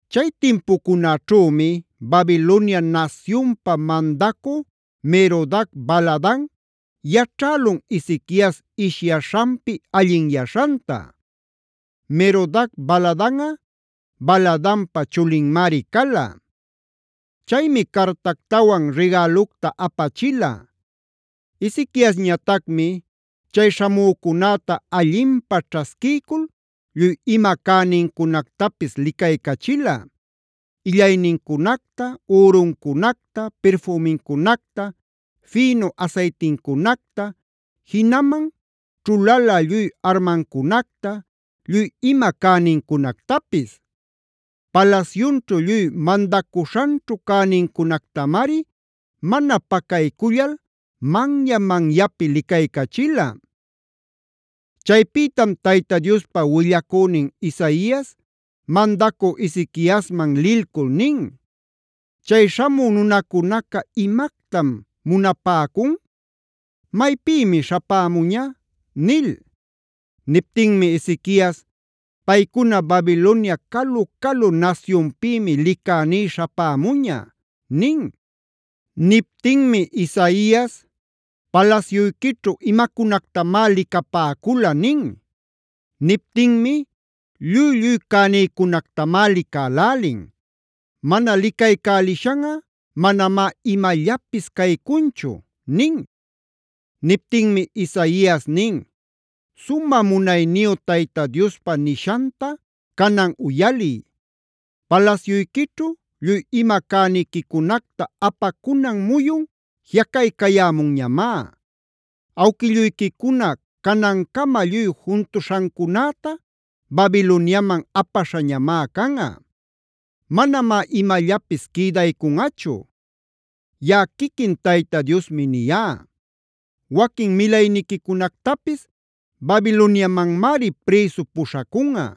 Chay timpucunaćhümi Babilonia nasyunpa mandacü Merodac-baladan yaćhälun Ezequias ishyaśhanpi allinyaśhanta. (Merodac-baladanꞌa Baladanpa chulinmari cala.) Chaymi cartactawan rigälucta apachila. Ezequiasñatacmi chay śhamücunäta allinpä ćhasquiycul lluy ima cänincunactapis licaycachila: illaynincunacta, üruncunacta, pirfümincunacta, fïnu asaytincunacta, jinaman ćhulalä lluy armancunacta, lluy ima cänincunactapis. Palasyunćhu lluy mandacuśhanćhu cänincunactamari mana pacaycullal manya-manyapi licaycachila. Chaypïtam Tayta Diospa willacünin Isaias mandacü Ezequiasman lilcul nin: “¿Chay śhamü nunacunaca imactam munapäcun? ¿Maypïmi śhapämuña?” nil. Niptinmi Ezequias: “Paycuna Babilonia calu-calu nasyunpïmi licäní śhapämuña” nin. Niptinmi Isaias: “¿Palasyuyquićhu imacunactamá licapäcula?” nin. Niptinmi: “Lluy-lluy cänïcunactamá licälälin. Mana licaycälishanꞌa manamá imallapis caycunchu” nin. Niptinmi Isaias nin: “Sumä munayniyu Tayta Diospa nishanta canan uyaliy: ‘Palasyuyquićhu lluy ima cäniquicunacta apacunan muyun jiꞌacaycayämunñamá; awquilluyquicuna canancama lluy juntuśhancunäta Babiloniaman apaśhañamá canꞌa. Manamá imallapis quïdaycunꞌachu; yaꞌa quiquin Tayta Diosmi niyá. Waquin milayniquicunactapis Babiloniamanmari prïsu puśhacunꞌa.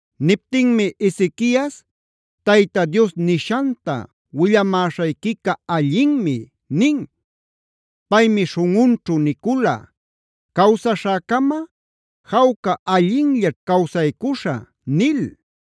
Niptinmi Ezequias: “Tayta Dios nishanta willamäśhayquica allinmi” nin. Paymi śhunꞌunćhu nicula: “Cawsaśhäcama jawca, allinllaćh cawsaycuśhä” nil.